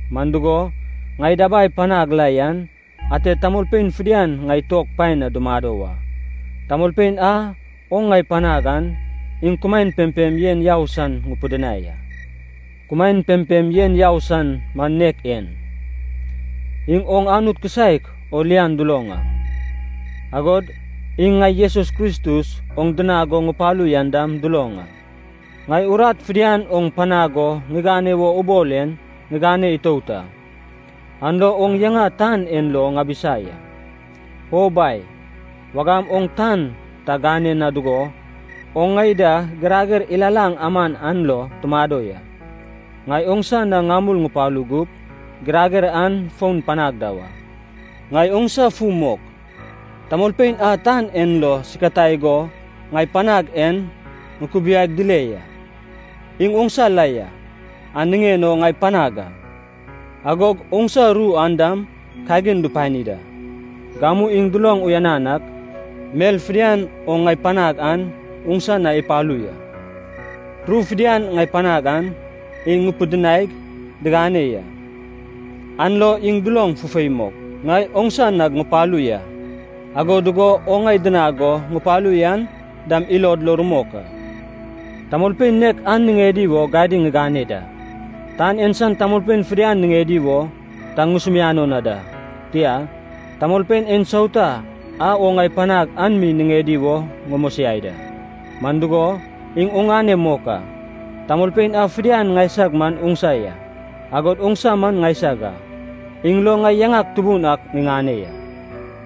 Man dugo, ŋai dabai panag la yen ate tamolpein fidian ŋai tuog paen na dumado wa. Tamolpein a oŋ ŋai panag an, iŋ kumaen pempem yen yau san ŋupidinai a. Kumaen pempem yen yau san man nek en. Iŋ oŋ Anut kisaek o lian duloŋ a, agod iŋ ŋai Jesus Kristus oŋ dinag go ŋupalu yan dam duloŋ a. Ŋai urat fidian oŋ panag go ŋigane wo ubol en ŋigane itout a. An lo oŋ yaŋa tan en lo ŋabisa ya. O Bai, wagam oŋ tan ta gane na dugo, oŋ ŋai da girager ilalaŋ aman an lo tumado ya. Ŋai oŋsa na ŋamul ŋupalu gup, girager an fon panag da wa. “Ŋai oŋsa fu mok, tamolpein a tan en lo sikatai go ŋai panag en ŋukubiaig dile ya. Iŋ oŋsa la ya, an niŋen o ŋai panag a. Agog oŋsa ru an dam kagin dupani da. Gamu iŋ duloŋ uyanan ak, mel fidian oŋ ŋai panag an oŋsa na ipalu ya. Ru fidian ŋai panag an iŋ ŋupidinaig, diŋane ya. An lo iŋ duloŋ fufei mok, ŋai oŋsa nag ŋupalu ya, ago dugo oŋ ŋai dinag go ŋupalu yan dam ilod lo rumok a. Tamolpein nek an niŋedi wo gadiŋ ŋigane da. Tan en san tamolpein fidian niŋedi wo ta ŋusumiano na da. Tia, tamolpein ensauta a oŋ ŋai panag an mi niŋedi wo ŋumosiai da. Man dugo, iŋ oŋane mok a. Tamolpein a fidian ŋaisag man oŋsa ya, agod oŋsa man ŋaisag a. Iŋ lo ŋai yaŋak tubun ak ŋiŋane ya.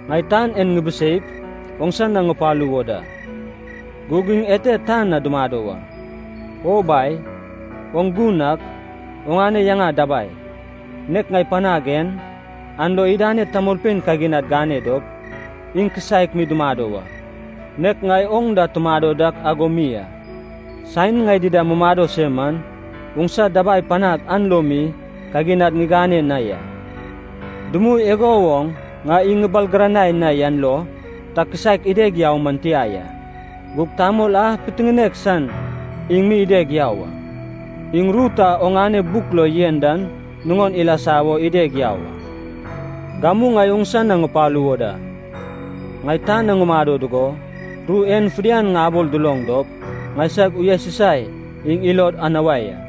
Ŋai tan en ŋibiseip, oŋsa na ŋupalu wo da. Gug iŋ ete tan na dumado wa. O Bai, oŋ gun ak, oŋane yaŋa dabai, nek ŋai panag en, an lo idaned tamolpein kaginad gane dop, iŋ kisaek mi dumado wa, nek ŋai oŋ da tumado dak ago mi a. Saen ŋai dida mumado se man, oŋsa dabai panag an lo mi kaginad ŋigane na ya. Dumui igo woŋ ŋai iŋ ŋibalgiranai na yan lo, ta kisaek ideg yau man tia ya. Gug tamol a pitiŋinek san iŋ mi ideg yau a. Iŋ ru ta oŋane buk lo yen dan nuŋon ilasa wo ideg yau a. “Gamu ŋai oŋsa na ŋupalu wo da. Ŋai tan na ŋumado dugo, ru en fidian ŋabol duloŋ dop, ŋaisag uyasusai iŋ ilod anuai a.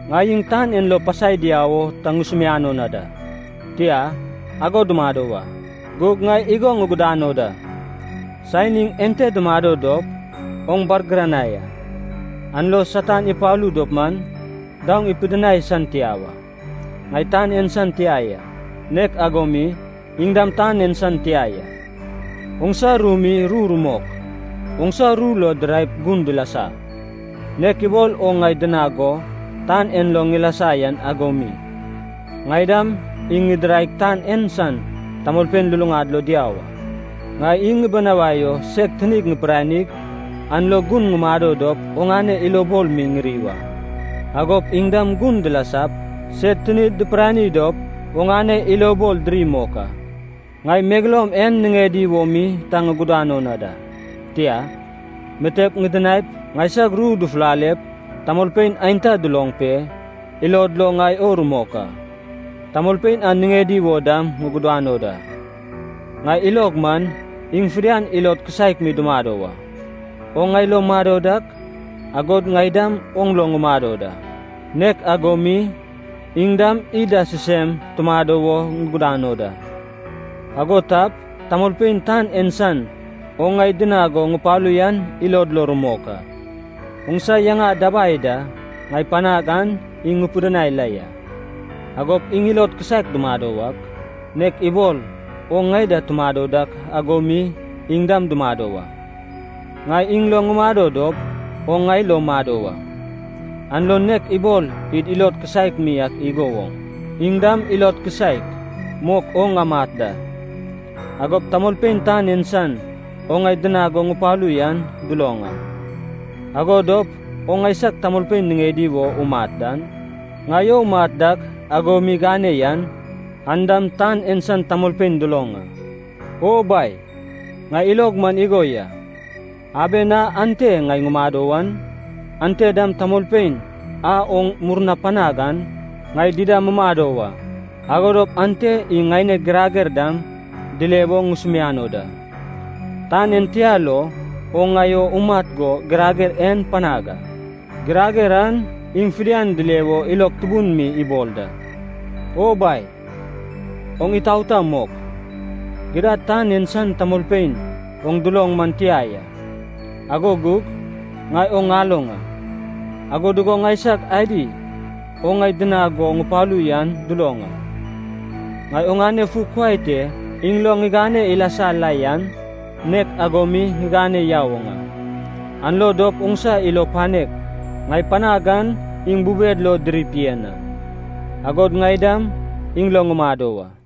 Ŋai iŋ tan en lo pasai diau o ta ŋusumiano na da. Tia, ago dumado wa. Gug ŋai igo ŋugudano da, saen iŋ ente dumado dop oŋ bargiranai a. An lo Satan ipalu dop man, daoŋ ipidinai san tia wa. Ŋai tan en san tia ya, nek ago mi, iŋ dam tan en san tia ya. Oŋsa ru mi ru rumok. Oŋsa ru lo diraip gun dilasa. Nek ibol oŋ ŋai dinag go tan en lo ŋilasa yan ago mi, ŋai dam iŋ ŋidiraig tan en san tamolpein luluŋad lo diau a. Ŋai iŋ ŋibinawai o seg tinig ŋipiranig, an lo gun ŋumado dop oŋane ilobol mi ŋiri wa. Agop iŋ dam gun dilasap, sed tinid dipirani dop oŋane ilobol diri mok a. “Ŋai megeloum en niŋedi wo mi ta ŋugudano na da. Tia, mitep ŋidinaip, ŋaisag ru dufulalep tamolpein aenta duloŋ pe, ilod lo ŋai o rumok a. Tamolpein an niŋedi wo dam ŋugudano da. Ŋai ilog man, iŋ fidian ilod kisaek mi dumado wa. Oŋ ŋai lo mado dak, agod ŋai dam oŋ lo ŋumado da, nek ago mi iŋ dam id da sisem tumado wo ŋugudano da. Ago tap, tamolpein tan en san oŋ ŋai dinag go ŋupalu yan ilod lo rumok a. Oŋsa yaŋa dabai da ŋai panag an iŋ ŋupidinai la ya. Agop iŋ ilod kisaek dumado wak, nek ibol oŋ ŋai da tumado dak ago mi iŋ dam dumado wa. Ŋai iŋ lo ŋumado dop, oŋ ŋai lo mado wa. An lo nek ibol id ilod kisaek mi ak igo woŋ, iŋ dam ilod kisaek mok o ŋamat da. Agop tamolpein tan en san oŋ ŋai dinag go ŋupalu yan duloŋ a. Ago dop oŋ ŋaisag tamolpein niŋedi wo umat dan, ŋai o umat dak ago mi gane yan, an dam tan en san tamolpein duloŋ a. “O Bai, ŋai ilog man igo ya, aben a ante ŋai ŋumado wan, ante dam tamolpein a oŋ murnap panag an ŋai dida mumado wa. Ago dop ante iŋ ŋaineg girager dam dile wo ŋusumiano da. Tan en tia lo oŋ ŋai o umat go girager en panag a. Girager an iŋ fidian dile wo ilog tubun mi ibol da. “O Bai, oŋ itaota mok, gidad tan en san tamolpein oŋ duloŋ man tia ya, ago gug ŋai oŋ ŋaloŋ a. Ago dugo ŋaisag adi oŋ ŋai dinag go ŋupalu yan duloŋ a. Ŋai oŋane fu kuai te iŋ lo ŋigane ilasa la yan, nek ago mi ŋigane yau oŋ a. An lo dop oŋsa ilo panek ŋai panag an iŋ bubed lo dirip yen a, agod ŋai dam iŋ lo ŋumado wa.”